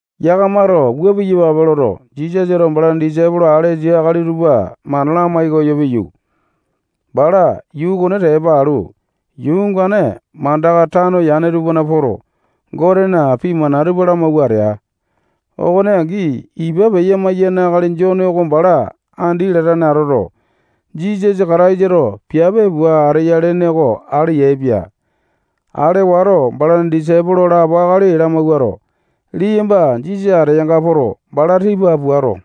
Yakamato wua piyapape loto, Jisasato balana disaipolo alesa akali tupa mana lamai koyo piyu, bala yuu okone tepa alu, yuu ongane mandaka tano yane tupana poto, Gotena pii mana tupa lamawua atea. Okone angi, ipa peya-maiyane akali Jone oko bala andi latane atoto, Jisasa Kataisato piape pua ateya lene oko ale yaepia. Ale wato, balana disaipolo lapo akali lamawuato, liyamba Jisasa ateyanga poto, bala tipa puato,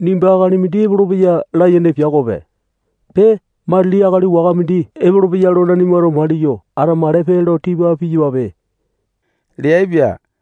nimba akali mindi epolopeya layene pia okope. Pee, matili akali waka mindi epolopeya lo nanimato maliyo atamakalepe lo tipa piyapape leaipia.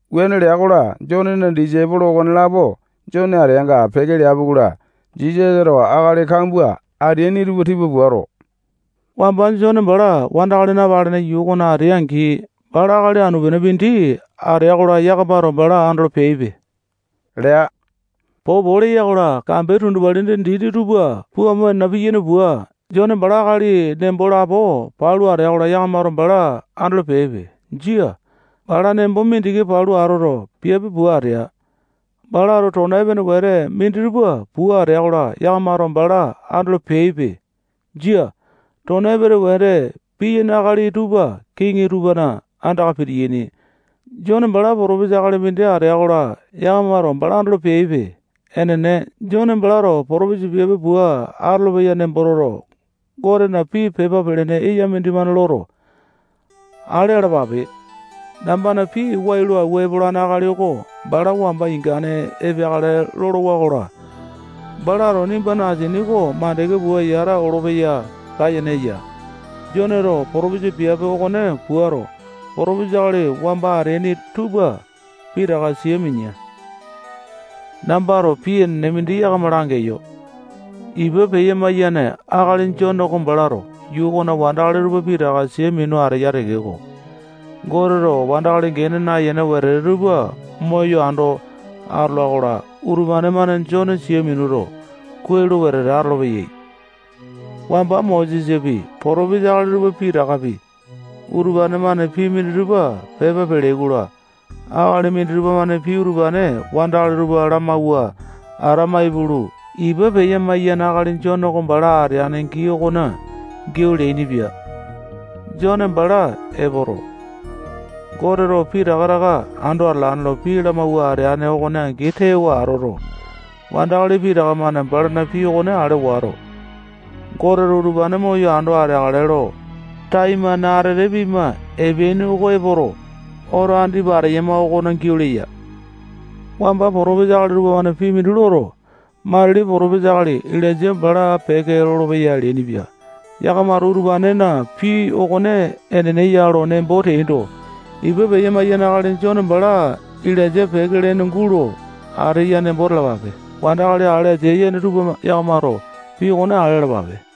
Wuane lea-kola, Jonena disaipolo okonelapo Jone ateanga peke leapi-kola, Jisasato wandakali kambua ateaini tupa tipa puato, wamba Jone bala wandakali napalene yuu okona atea-angi, bala akali anu-pene mindi atea-kola, yakamato bala andolo peaipe lea. Popo leya-kola, kambe tundupalina dini tupa pua amo nena piyane pua, Jone bala akali nembo lapo palu atea-kola, yakamato bala andolo peaipe. Jia. Bala nembo mindiki palu atoto, piape pua atea. Balato tona epene wete minditupa pua atea-kola, yakamato bala andolo peaipe. Jia. Tona epene wete piyaini akali tupa kiŋi tupana andaka pitiyaini. Jone bala potopesa akali mindi atea-kola, yakamato bala andolo peaipe. Enene. Jone balato potopesa piape pua atolopeya nembo toto, Gotena pii pepa pelene eya mindimane loto, Ale alapape. Nambana pii wai lo awua epolane akali oko bala wamba ingane epeakale lolowa-kola, balato nimbana asini oko mandeke pua yata olopeya layene eya. Joneto potopesa piape okone puato, potopesa akali wamba ateaini tupa pitaka sia minea. Nambato pii enene mindi yakama langeyo. Ipa peya-maiyane akali Jone oko balato yuu okona wandakali tupa pitaka sia minu ateya tekeko, Goteto wandakali gene nayene wetete tupa moyo ando atola-kola, utupane-mane Jone sia minuto, kuai lo wetete atolopeyai. Wamba Mosesapi, potopesa akali tupa pitakapi, utupane-mane pii minditupa pepa peleai-kola, akali minditupa-mane pii utupane wandakali tupa lamawua atama ipulu, ipa peya-maiyane akali Jone oko bala ateane gii okona giau leainipia. Jone bala epoto, Goteto pitaka taka ando atalane lo pii lamawua ateane okone angi tewa atoto, wandakali pitaka-mane balana pii okone ale wato, Goteto utupane moyo ando ateakale lo taimane atete pima epeaini oko epoto, oto andipa ateyama okona giau leya. Wamba potopesa akali tupamane pii mindi loto, matili potopesa akali Ilainja bala peke lolopeya leainipia. Yakamato utupanena pii okone enene ya lo nembo teaindo, ipa peya-maiyane akali Jone bala Ilainja peke lene gulo ateane nembo talapape. Wandakali ale asia yene tupa yakamato pii okone ale alapape.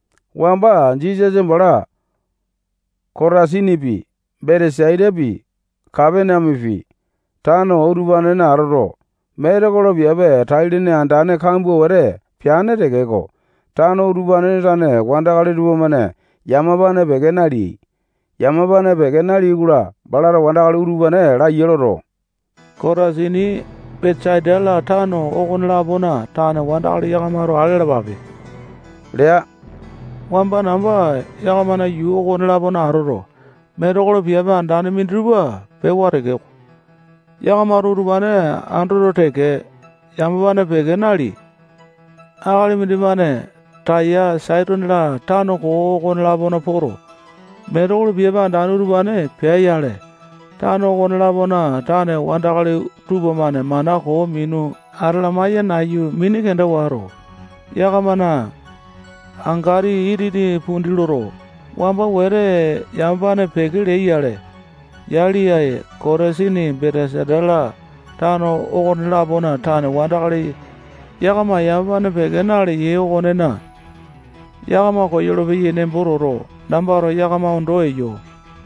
Wamba Jisasa bala Kotasinipi, Betesaitapi, Kapaneamepi, tano utupanena atoto, metekolo piape tai-lene andane kambua wete peane tekeko, tano utupanena tane wandakali tupamane yamapane peke naleai. Yamapane peke naleai-kola, balato wandakali utupane laiya loto, Kotasini, Betesaita-la, tano okone-lapona tane wandakali yakamato ale alapape lea. Wamba namba yakamana yuu okone-lapona atoto, metekolo piape andane minditupa pewa tekeko, yakamato utupane andoto teke, yamapane peke naleai. Akali mindimane Taya, Saitone-la, tano koo okone-lapona poto, metekolo piape andane utupane pea-yale, tano okone-lapona tane wandakali tupamane mana koo minu atalamae-ya nayu, mini kenda wato, yakamana angati itini pundi loto, wamba wete yamapane peke leai-yale. Yali, ae, Kotasini, Betesaita-la, tano okone-lapona tane wandakali yakama yamapane peke naleyai okonena, yakama koyolo-peyai nembo toto, nambato yakama ondo eyo.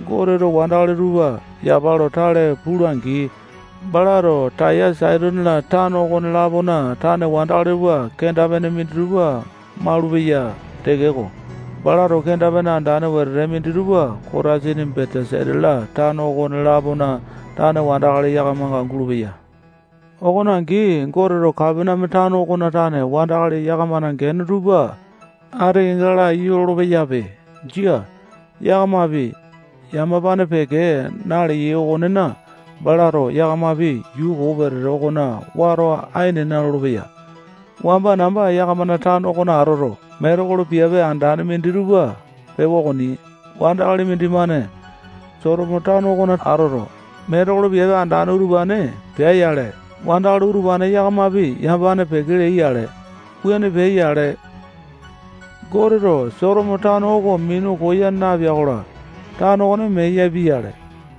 Goteto wandakali tupa yapa lo tale pula-angi, balato Taya, Saitone-la, tano okone-lapona tane wandakali tupa kenda-pene minditupa maulupeya tekeko, balato kenda-pene andane wete minditupa Kotasini, Betesaita-la, tano okone-lapona tane wandakali yakamanga gulupeya. Okone angi, Goteto Kapaneame tano okona tane wandakali yakamana gene tupa ati kenga laiyu lolo-peyape. Jia. Yakamapi yamapane peke naleyai okonena, balato yakamapi yuu koo wetete okona wata ai nena lolopeya. Wamba namba yakamana tano okona atoto, metekolo piape andane minditupa pewa okoni. Wandakali mindimane Sotomo tano okona atoto, metekolo piape andane utupane pea-yale, wandakali utupane yakamapi yamapane peke leai-yale. Wuane peai-yale, Goteto Sotomo tano oko minu koya napea-kola, tano okone mee yapia-yale.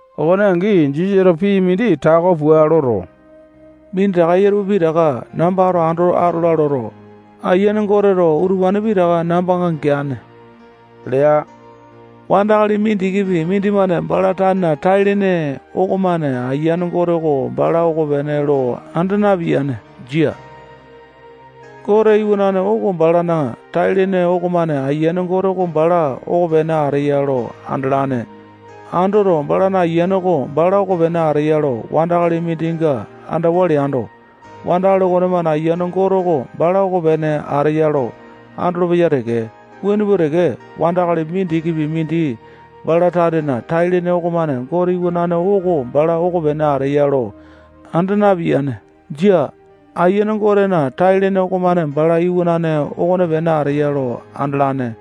Okone angi, Jisasato pii mindi tako pua loto, minditaka eya tupa pitaka nambato ando atola loto, Ayiane Goteto utupane pitaka nambanga geane lea. Wandakali mindikipi mindimane bala tanena tai-lene okomane Ayiane Gote oko bala okopene lo anda napiyane. Jia. Gote Iwanane oko balana tai-lene okomane Ayiane Gote oko bala okopene ateya lo andalane. Andoto, balana ayiane oko bala okopene ateya lo wandakali mindinga andawa leando, wandakali okonemane Ayiane Gote oko bala okopene ateya lo andolopeya teke. Wuane pua teke, wandakali mindikipi mindi bala tanena tai-lene okomane Gote Iwanane oko bala okopene ateya lo anda napiyane. Jia. Ayiane Gotena tai-lene okomane bala Iwanane okopene ateya lo andalane.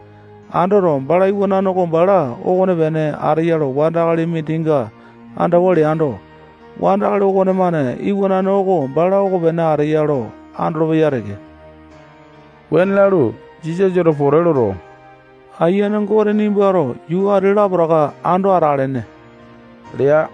Andoto, balana Iwanane oko bala okopene ateya lo wandakali mindinga andawa leando, wandakali okonemane Iwanane oko bala okopene ateya lo andolopeya teke. Wuane lalu, Jisasato pote loto, Ayiane Gote, nimbato yuu ati-la, lapotaka ando atelene lea.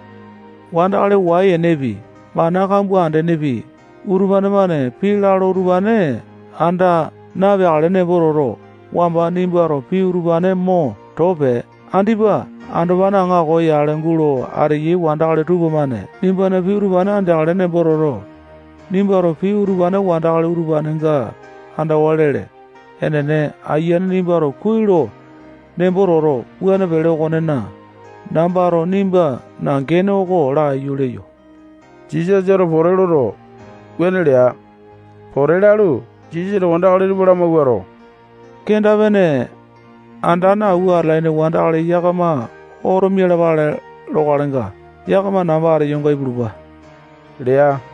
Wandakali wai-enepi, mana kambua andenepi, utupane-mane pii lalo utupane anda napeakale nembo toto, wamba nimbato pii utupane mo too pee. Andipa andopane aŋako yale gulo ateyai wandakali tupamane nimbana pii utupane andeakale nembo toto, nimbato pii utupane wandakali utupanenga andawa lele. Enene, ayiane, nimbato kuai lo nembo toto, wuane pele okonena, nambato nimbana gene oko laiyu leyo. Jisasato pote loto, wuane lea. Pote lalu, Jisasato wandakali tupa lamawuato, kenda-pene andane awua atalaini wandakali yakama oto mialapale lokalenga, yakama namba ateyonga ipulupa lea.